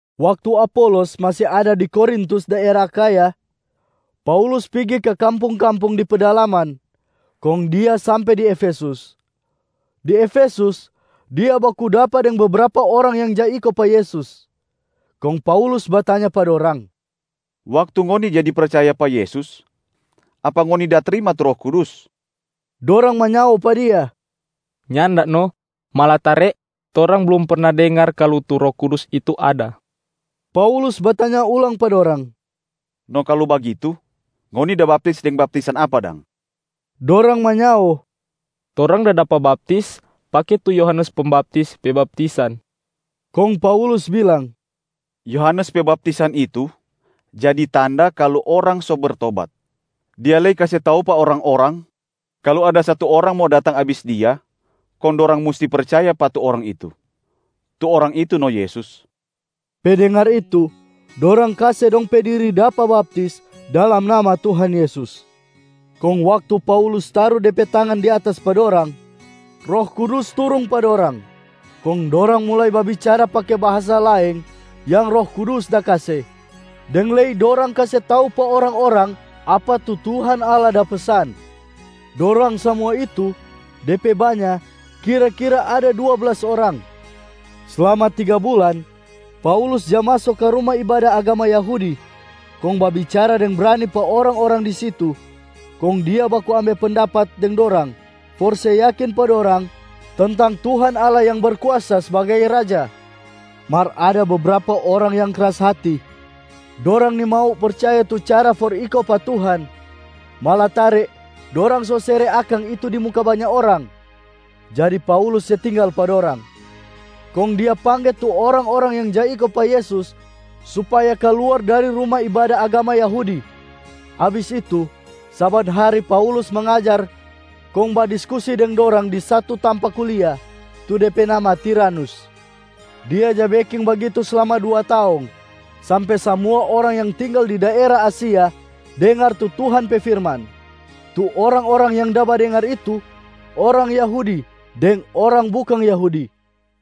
Waktu Apolos masi ada di Korintus daera Akhaya, Paulus pigi ka kampung-kampung di pedalaman kong dia sampe di Efesus. Di Efesus, dia baku dapa deng bebrapa orang yang ja iko pa Yesus. Kong Paulus batanya pa dorang, “Waktu ngoni jadi percaya pa Yesus, apa ngoni da trima tu Roh Kudus?” Dorang manyao pa dia, “Nyanda no, malatare torang blum perna dengar kalu tu Roh Kudus itu ada.” Paulus batanya ulang pa dorang, “No kalu bagitu, ngoni da baptis deng baptisan apa dang?” Dorang manyao, “Torang da dapa baptis pake tu Yohanes Pembaptis pe baptisan.” Kong Paulus bilang, “Yohanes pe baptisan itu jadi tanda kalu orang so bertobat. Dia lei kase tau pa orang-orang kalu ada satu Orang mo datang abis dia, kong dorang musti percaya pa tu Orang itu. Tu Orang itu no Yesus.” Pe dengar itu, dorang kase dong pe diri dapa baptis dalam nama Tuhan Yesus. Kong waktu Paulus taru de pe tangan di atas pa dorang, Roh Kudus turung pa dorang, kong dorang mulai babicara pake bahasa laeng yang Roh Kudus da kase, deng lei dorang kase tau pa orang-orang apa tu Tuhan Allah da pesan. Dorang samua itu, de pe banya kira-kira ada dua blas orang. Slama tiga bulan, Paulus ja maso ka ruma ibada agama Yahudi kong babicara deng brani pa orang-orang di situ, kong dia baku ambe pendapat deng dorang for se yakin pa dorang tentang Tuhan Allah yang Berkuasa sbagai Raja. Mar ada bebrapa orang yang kras hati, dorang nimau percaya tu cara for iko pa Tuhan, malatare dorang sosere akang itu di muka banya orang. Jadi Paulus se tinggal pa dorang, kong dia pangge tu orang-orang yang ja iko pa Yesus supaya kaluar dari ruma ibada agama Yahudi. Abis itu, saban hari Paulus mangajar kong badiskusi deng dorang di satu tampa kulia, tu de pe nama Tiranus. Dia ja beking bagitu slama dua taong, sampe samua orang yang tinggal di daera Asia dengar tu Tuhan pe firman. Tu orang-orang yang da badengar itu, orang Yahudi deng orang bukang Yahudi.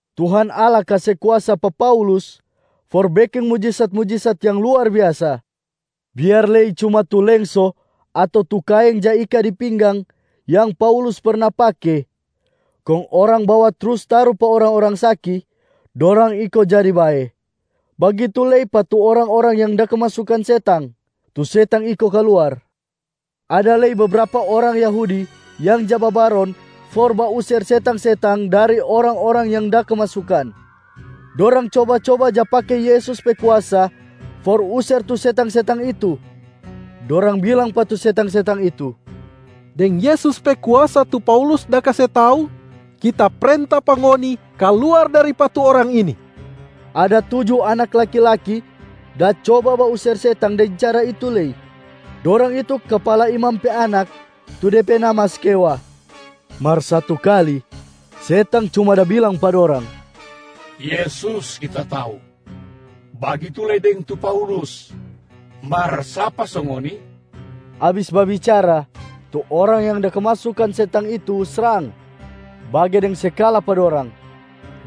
Tuhan Allah kase kuasa pa Paulus for beking mujisat-mujisat yang luar biasa. Biar lei cuma tu lengso ato tu kaeng ja ika di pinggang yang Paulus perna pake kong orang bawa trus taru pa orang-orang saki, dorang iko jadi bae. Bagitu lei pa tu orang-orang yang da kemasukan setang, tu setang iko kaluar. Ada lei bebrapa orang Yahudi yang ja babaron for bauser setang-setang dari orang-orang yang da kemasukan. Dorang coba-coba ja pake Yesus pe kuasa for user tu setang-setang itu. Dorang bilang pa tu setang-setang itu, “Deng Yesus pe kuasa tu Paulus da kase tau, kita prenta pa ngoni kaluar dari pa tu orang ini!” Ada tuju anak laki-laki da coba bauser setang deng cara itu lei. Dorang itu kapala imam pe anak tu de pe nama Skewa. Mar satu kali, setang cuma da bilang pa dorang, “Yesus kita tau, bagitu lei deng tu Paulus. Mar sapa so ngoni?” Abis babicara, tu orang yang da kemasukan setang itu srang, bage deng se kala pa dorang.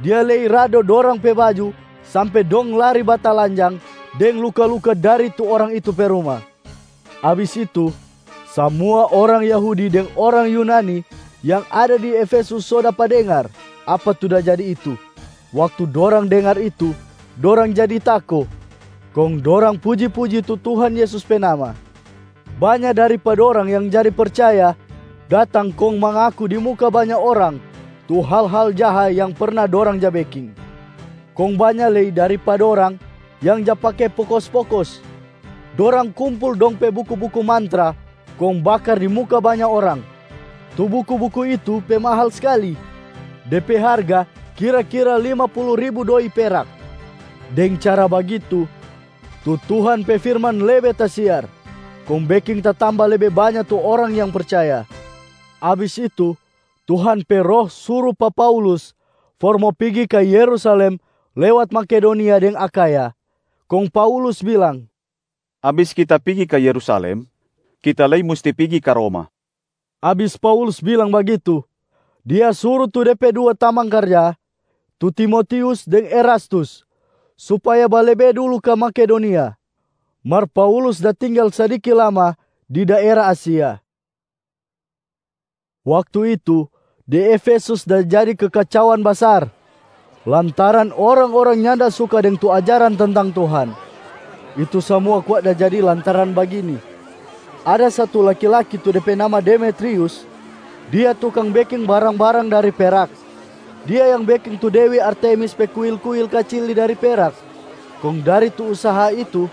Dia lei rado dorang pe baju sampe dong lari batalanjang deng luka-luka dari tu orang itu pe ruma. Abis itu, samua orang Yahudi deng orang Yunani yang ada di Efesus so dapa dengar apa tu da jadi itu. Waktu dorang dengar itu dorang jadi tako, kong dorang puji-puji tu Tuhan Yesus pe nama. Banya dari pa dorang yang jadi percaya datang kong mangaku di muka banya orang tu hal-hal jaha yang perna dorang ja beking. Kong banya lei dari pa dorang yang ja pake pokos-pokos. Dorang kumpul dong pe buku-buku mantra kong bakar di muka banya orang. Tu buku-buku itu pe mahal skali, de pe harga kira-kira lima pulu ribu doi perak. Deng cara bagitu, tu Tuhan pe firman lebe tasiar, kong beking tatamba lebe banya tu orang yang percaya. Abis itu, Tuhan pe Roh suru pa Paulus for mo pigi ka Yerusalem lewat Makedonia deng Akhaya. Kong Paulus bilang, “Abis kita pigi ka Yerusalem, kita lei musti pigi ka Roma.” Abis Paulus bilang bagitu, dia suru tu de pe dua tamang karja tu Timotius deng Erastus supaya balebe dulu ka Makedonia, mar Paulus da tinggal sadiki lama di daera Asia. Waktu itu, di Efesus da jadi kekacauan basar lantaran orang-orang nyanda suka deng tu ajaran tentang Tuhan. Itu samua kwa da jadi lantaran bagini: ada satu laki-laki tu de pe nama Demetrius. Dia tukang beking barang-barang dari perak. Dia yang beking tu dewi Artemis pe kuil-kuil kacili dari perak. Kong dari tu usaha itu,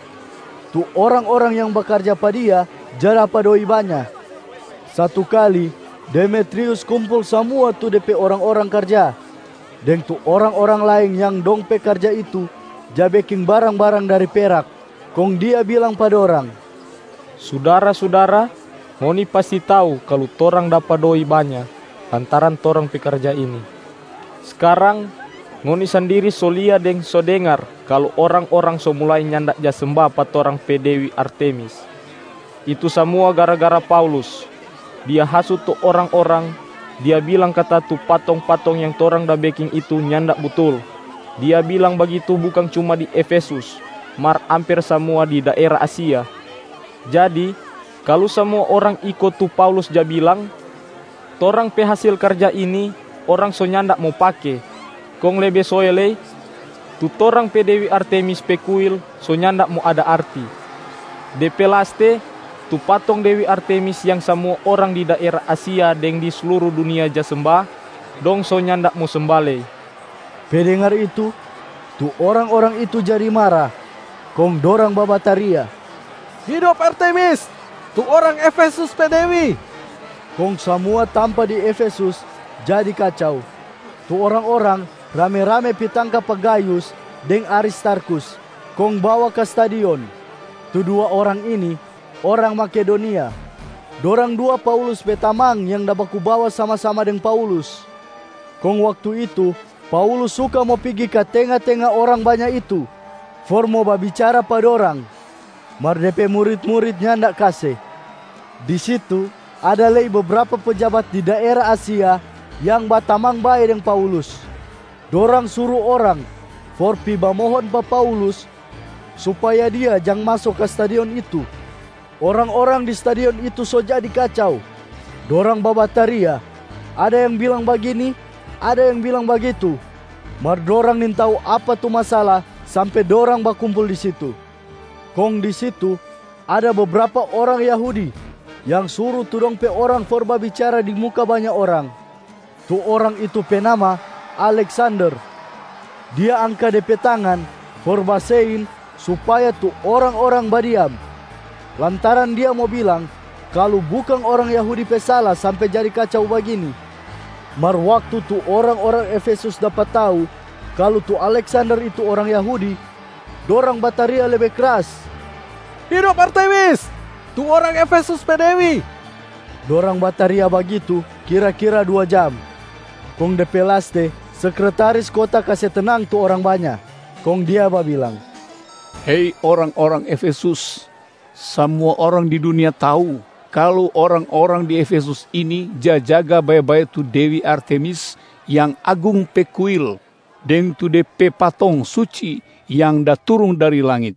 tu orang-orang yang bakarja pa dia ja dapa doi banya. Satu kali, Demetrius kumpul samua tu de pe orang-orang karja deng tu orang-orang laeng yang dong pe karja itu ja beking barang-barang dari perak. Kong dia bilang pa dorang, “Sudara-sudara, ngoni pasti tau kalu torang dapa doi banya lantaran torang pe karja ini. Skarang, ngoni sandiri so lia deng so dengar kalu orang-orang so mulai nyanda ja semba pa torang pe dewi Artemis. Itu samua gara-gara Paulus. Dia hasut tu orang-orang, dia bilang kata tu patong-patong yang torang da beking itu nyanda butul. Dia bilang bagitu bukang cuma di Efesus, mar amper samua di daera Asia. Jadi kalu samua orang iko tu Paulus ja bilang, torang pe hasil karja ini orang so nyanda mo pake. Kong lebe soe lei, tu torang pe dewi Artemis pe kuil so nyanda mo ada arti. De pe laste, tu patong dewi Artemis yang samua orang di daera Asia deng di sluru dunia ja semba, dong so nyanda mo semba lei.” Pe dengar itu, tu orang-orang itu jadi mara, kong dorang babataria, “Hidop Artemis, tu orang Efesus pe dewi!” Kong samua tampa di Efesus jadi kacau. Tu orang-orang rame-rame pi tangka pa Gayus deng Aristarkhus kong bawa ka stadion. Tu dua orang ini orang Makedonia, dorang dua Paulus pe tamang yang da baku bawa sama-sama deng Paulus. Kong waktu itu, Paulus suka mo pigi ka tenga-tenga orang banya itu for mo babicara pa dorang, mar de pe murit-murit nyanda kase. Di situ, ada lei bebrapa pejabat di daera Asia yang batamang bae deng Paulus. Dorang suru orang for pi bamohon pa Paulus supaya dia jang maso ka stadion itu. Orang-orang di stadion itu so jadi kacau. Dorang babataria, ada yang bilang bagini ada yang bilang bagitu, mar dorang nintau apa tu masala sampe dorang bakumpul di situ. Kong di situ, ada bebrapa orang Yahudi yang suru tu dong pe orang for babicara di muka banya orang. Tu orang itu pe nama Aleksander. Dia angka de pe tangan for basein supaya tu orang-orang badiam, lantaran dia mo bilang kalu bukang orang Yahudi pe sala sampe jadi kacau bagini. Mar waktu tu orang-orang Efesus dapa tau kalu tu Aleksander itu orang Yahudi, dorang bataria lebe kras, “Hidop Artemis, tu orang Efesus pe dewi!” Dorang bataria bagitu kira-kira dua jam. Kong de pe laste, sekretaris kota kase tenang tu orang banya, kong dia babilang, “Hei orang-orang Efesus! Samua orang di dunia tau kalu orang-orang di Efesus ini ja jaga bae-bae tu dewi Artemis yang agung pe kuil deng tu de pe patong suci yang da turung dari langit.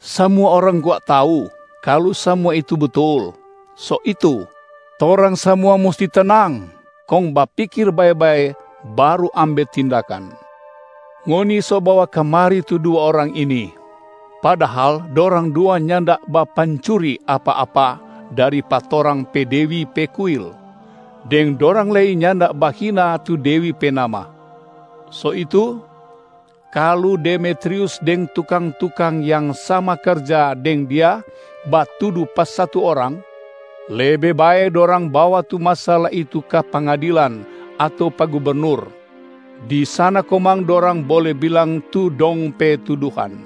Samua orang kwa tau kalu samua itu butul. So itu, torang samua musti tenang kong bapikir bae-bae baru ambe tindakan. Ngoni so bawa kamari tu dua orang ini, padahal dorang dua nyanda bapancuri apa-apa dari pa torang pe dewi pe kuil, deng dorang lei nyanda bahina tu dewi pe nama. So itu, kalu Demetrius deng tukang-tukang yang sama karja deng dia batudu pa satu orang, lebe bae dorang bawa tu masala itu ka pengadilan ato pa gubernur. Di sana komang dorang bole bilang tu dong pe tuduhan.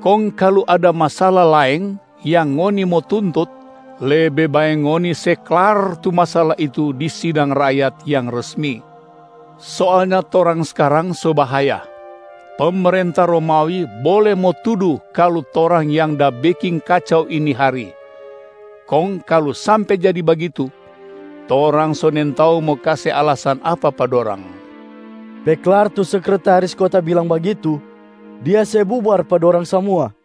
Kong kalu ada masala laeng yang ngoni mo tuntut, lebe bae ngoni se klar tu masala itu di sidang rakyat yang resmi. Soalnya torang skarang so bahaya. Pemerenta Romawi bole mo tudu kalu torang yang da beking kacau ini hari. Kong kalu sampe jadi bagitu, torang so nintau mo kase alasan apa pa dorang.” Pe klar tu sekretaris kota bilang bagitu, dia se bubar pa dorang samua.